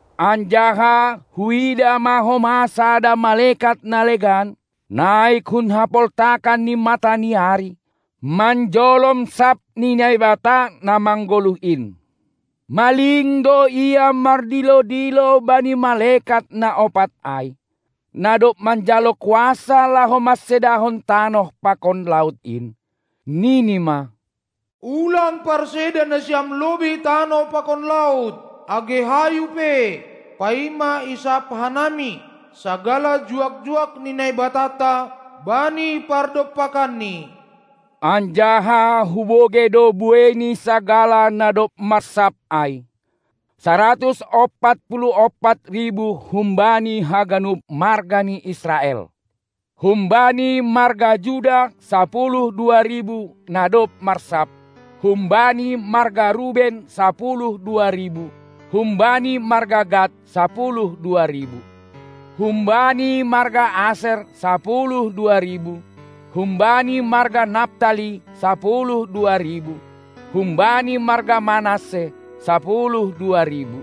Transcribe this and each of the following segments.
Anjaha huidah ma homa sada malekat na legan, naik hun hapoltakan ni mata ni ari, manjolom sap ni Naibata na manggoluh in. Maling do ia mardilo-dilo bani malekat na ompat ai, na dob manjalo kuasa laho mansedahon tanoh pakon laut in, nini ma: Ulang parseda nasiam lobei tanoh pakon laut, age hayu pe, paima isap hanami sagala juak-juak ni Naibatanta bani pardompakanni. Anjaha hubogei do buei ni sagala na dob marsap ai: Saratus ompat puluh ompat ribu humbani haganup marga ni Israel. Humbani marga Juda sapuluh dua ribu na dob marsap, humbani marga Ruben sapuluh dua ribu, humbani marga Gad sapuluh dua ribu, humbani marga Aser sapuluh dua ribu, humbani marga Naptali sapuluh dua ribu, humbani marga Manasse sapuluh dua ribu,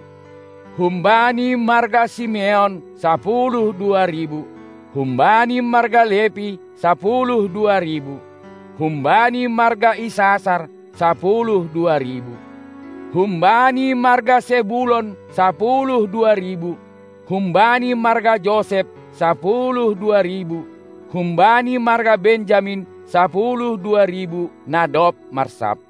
humbani marga Simeon sapuluh dua ribu, humbani marga Lepi sapuluh dua ribu, humbani marga Isasar sapuluh dua ribu, humbani marga Sebulon sapuluh dua ribu, humbani marga Josep sapuluh dua ribu, humbani marga Benjamin sapuluh dua ribu, na dob marsap.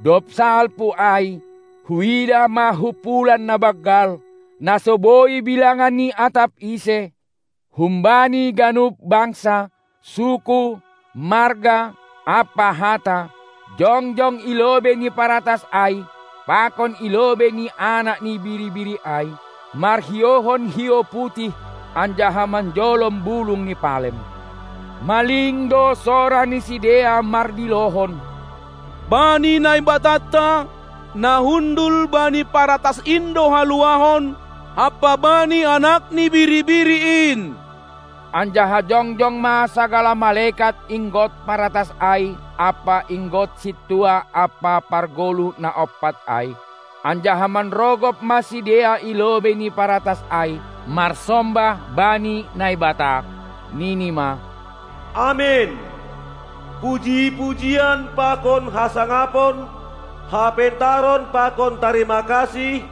Dob salpu ai, huidah ma humpulan na banggal, na so boi bilangan ni atap ise, humbani ganup bangsa, suku, marga, ampa hata jongjong i lobei ni paratas ai pakon i lobei ni Anak ni Biri-biri ai, marhiouhon hiou putih anjaha manjolom bulung ni palem. Maling do sora ni sidea mardilohon: Bani Naibatanta, na hundul bani paratas in do haluahon, ampa bani Anak ni Biri-biri in! Anjaha jongjong ma sagala malekat inggot paratas ai ampa inggot sintua ampa pargoluh na ompat ai, anjaha manrogop ma sidea i lobei ni paratas ai marsombah bani Naibata, nini ma: Amen! Puji-pujian pakon hasangapon, hapentaron pakon tarima kasih,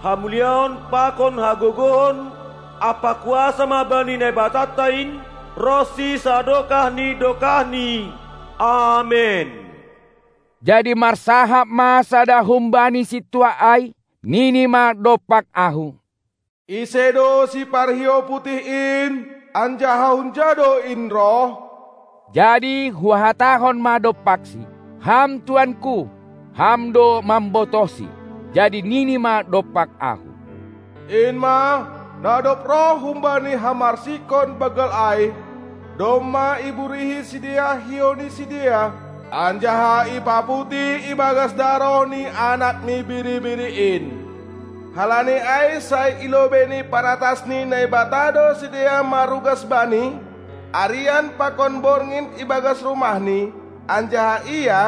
hamuliaon pakon hagogohon ampa kuasa ma bani Naibatanta in ronsi sadokah ni dokahni! Amen. Jadi marsahap ma sada humbani sintua ai, nini ma dompak ahu: Ise do siparhiou putih in, anjaha hunja do in roh? Jadi huhatahon ma dompaksi: Ham tuanku, ham do mambotohsi. Jadi nini ma dompak ahu: In ma, na dob roh humbani hamarsikon banggal ai; domma iburihi sidea hiou ni sidea anjaha ipaputih ibagas daroh ni Anak ni Biri-biri in. Halani ai sai i lobei ni paratas ni Naibata do sidea marugas Bani arian pakon borngin ibagas rumahni, anjaha Ia,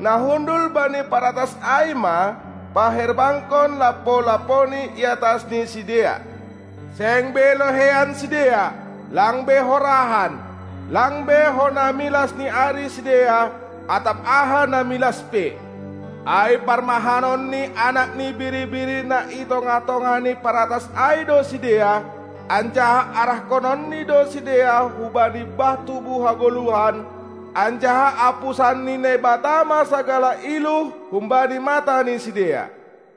na hundul bani paratas ai ma, paherbangkon lampo-lamponi iatas ni sidea. Seng be loheian sidea, lang be horahan, lang be hona milas ni ari sidea atap aha na milas pe; ai parmahanon ni Anak ni Biri-biri na i tongah-tongah ni paratas ai do sidea, anjaha arahkononni do sidea hubani bah tubuh hagoluhan, anjaha apusan ni Naibata ma sagala iluh humbani mata ni sidea.